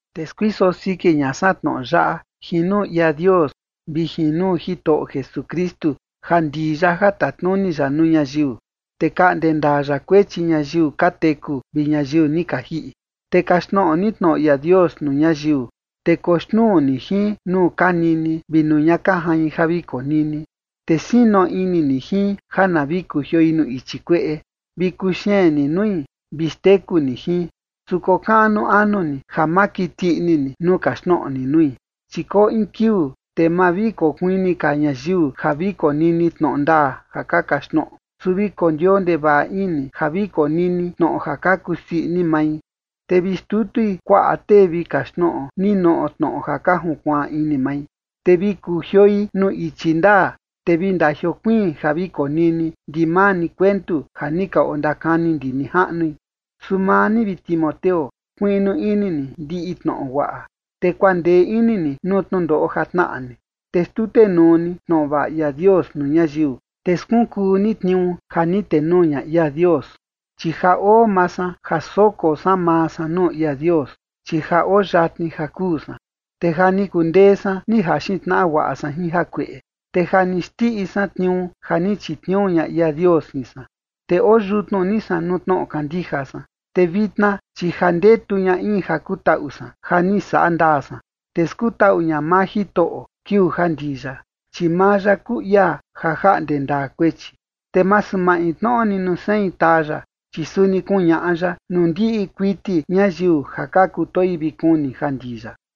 Te skuiso siki ña san tnoꞌo yaꞌa jin nuu ia Dios vi jin nuu Jitoꞌo Jesukristu ja ndii ya ja tatnuni ya nuu ñayiu, te kaꞌnde ndaa ya kuechi ñayiu ka teku vi ñayiu ni ka jiꞌi. Te kaxtnoꞌo ni tnoꞌo ia Dios nuu ñayiu, te koxnuu ni jin nuu ka nini vi nuu ña ka jain ja vi konini. Te sino ini ni jin ja na vi kujioi nuu ichi kueꞌe vi kuxeen ni nui vi xteku ni jin, su kokaꞌnu anu ni ja ma kiti ini ni nuu kaxtnoꞌo ni nui. Chi koo in kiuu, te ma vi kokuini ka ñayiu ja vi konini tnoꞌo ndaa ja ka kaxtnoꞌo, su vi kondioo ndevaꞌa ini ja vi konini tnoꞌo ja ka kusii ini mai, te vi xtutui kuaꞌa tee vi kaxtnoꞌo ninoꞌo tnoꞌo ja ka junkuaan ini mai. Te vi kujioi nuu ichi ndaa, te vi ndajiokuiin ja vi konini ndimaa ni kuentu ja ni ka ondakani ndi nijaꞌnui. Su maa ni, vi Timoteo, kuiꞌnu ini ni ndiꞌi tnoꞌo guaꞌa, te kuandee ini ni nuu tnundoꞌo ja tnaꞌa ni, te xtutenuu ni tnoꞌo vaꞌa ia Dios nuu ñayiu, te skunkuu ni tniuu ja ni tenuu ña ia Dios. Chi ja oo maa san ja soko san maa san nuu ia Dios, chi ja oo yatni ja kuu san. Te ja ni kundee san ni jaxin tnaꞌa guaꞌa san jin jakueꞌe, te ja ni xndiꞌi san tniuu ja ni chitniuu ña ia Dios jin san, te oo yutnu ni san nuu tnoꞌo kandija san. Te vitna, chi ja ndetu ña in ja kutaꞌu san ja ni saꞌa ndaa san, te skutaꞌu ña maa Jitoꞌo kiuu ja ndii ya, chi maa ya kuu ia ja jaꞌnde ndaa kuechi, te masu maintnoꞌo ni nuu sein taa ya, chi suni kuñaꞌa ya nuu ndiꞌi kuiti ñayiu ja ka kutoi vi kuni ja ndii ya.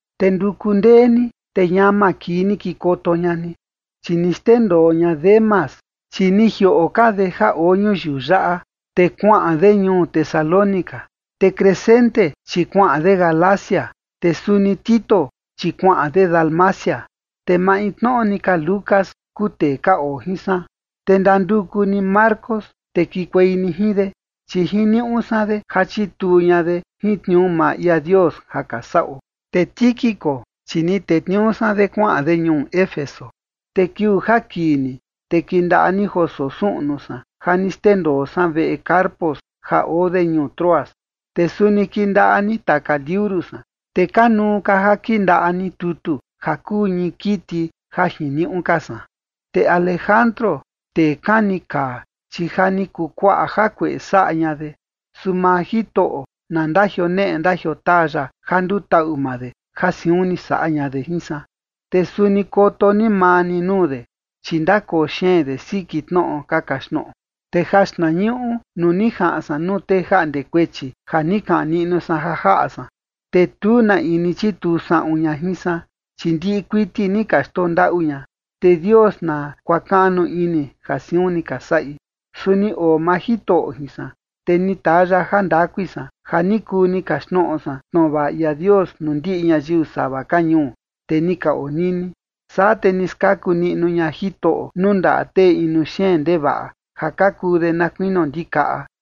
Te nduku ndee ni, te ñama kii ni kikoto ña ni. Chi ni xndendoo ña Demas, chi ni jioꞌo ka de ja oo ñuyiu yaꞌa, te kuaꞌan de ñuu Tesalónica. Te Crescente, chi kuaꞌan de Galacia. Te suni Tito, chi kuaꞌan de Dalmacia. Te maintnoꞌo ni ka Lucas kuu tee ka oo jin san. Te ndanduku ni Marcos, te kikuei ni jin de, chi jiniuꞌu san de ja chituu ña de jin tniuu maa ia Dios ja ka saꞌo. Te Tíquico, chi ni tetniuu san de kuaꞌan de ñuu Éfeso. Te kiuu ja kii ni, te kindaꞌa ni joo soo suꞌnu san ja ni xndendoo san veꞌe Carpo ja oo de ñuu Troas, te suni kindaꞌa ni taka liuru san, te kanuu ka ja kindaꞌa ni tutu ja kuu ñii kiti ja jiniuꞌu ka san. Te Alejandro, tee kani kaa, chi ja ni kuu kuaꞌa jakueꞌe saꞌa ña de. Su maa Jitoꞌo na ndajioneꞌe ndajiotaa ya ja ndutaꞌu maa de ja siun ni saꞌa ña de jin san. Te suni koto ni maa ni nuu de, chi ndakoo xeen de siki tnoꞌo ka kaxtnoꞌo. Te jaxtnañuꞌu nuu ni jaꞌan san nuu tee jaꞌnde kuechi ja ni kaꞌan niꞌnu san ja jaꞌa san, te tu na in ni chituu saꞌun ña jin san, chi ndiꞌi kuiti ni ka xndondaꞌu ña. Te Dios na kuakaꞌnu ini ja siun ni ka saꞌi. Su ni oo maa Jitoꞌo jin san, te ni taa ya jandakui san ja ni kuu ni kaxtnoꞌo san tnoꞌo vaꞌa ia Dios nuu ndiꞌi ñayiu sava ka ñuu, te ni ka onini. Saa te ni skaku niꞌnu ña Jitoꞌo nuu ndaꞌa tee inu xeen ndevaꞌa, ja ka kuu de na kuinio ndikaꞌa.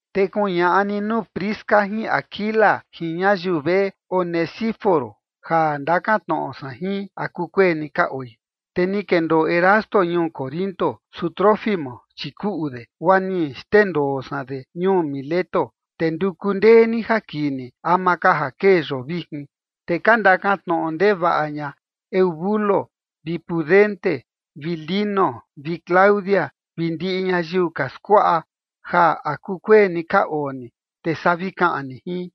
Te kuñaꞌa ni nuu Prisca jin Aquila jin ñayiu veꞌe Onesíforo ja ndakan tnoꞌo san jin, ¿a kukueni ka oi? Te ni kendoo Erasto ñuu Corinto, su Trófimo, chi kuꞌu de, guaa ni xndendoo san de ñuu Mileto. Te nduku ndee ni ja kii ni ama ka ja kee yoo vijin. Te ka ndakan tnoꞌo ndevaꞌa ña Eubulo vi Pudente vi Lino vi Claudia vi ndiꞌi ñayiu ka skuaꞌa, ja ¿a kukueni ka oo ni, te saa vi kaꞌan ni jin?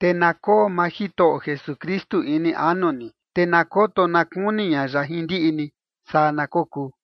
Te na koo maa Jitoꞌo Jesukristu ini anu ni. Te na koto na kuni ña ya jin ndiꞌi ni. Saa na kokuu.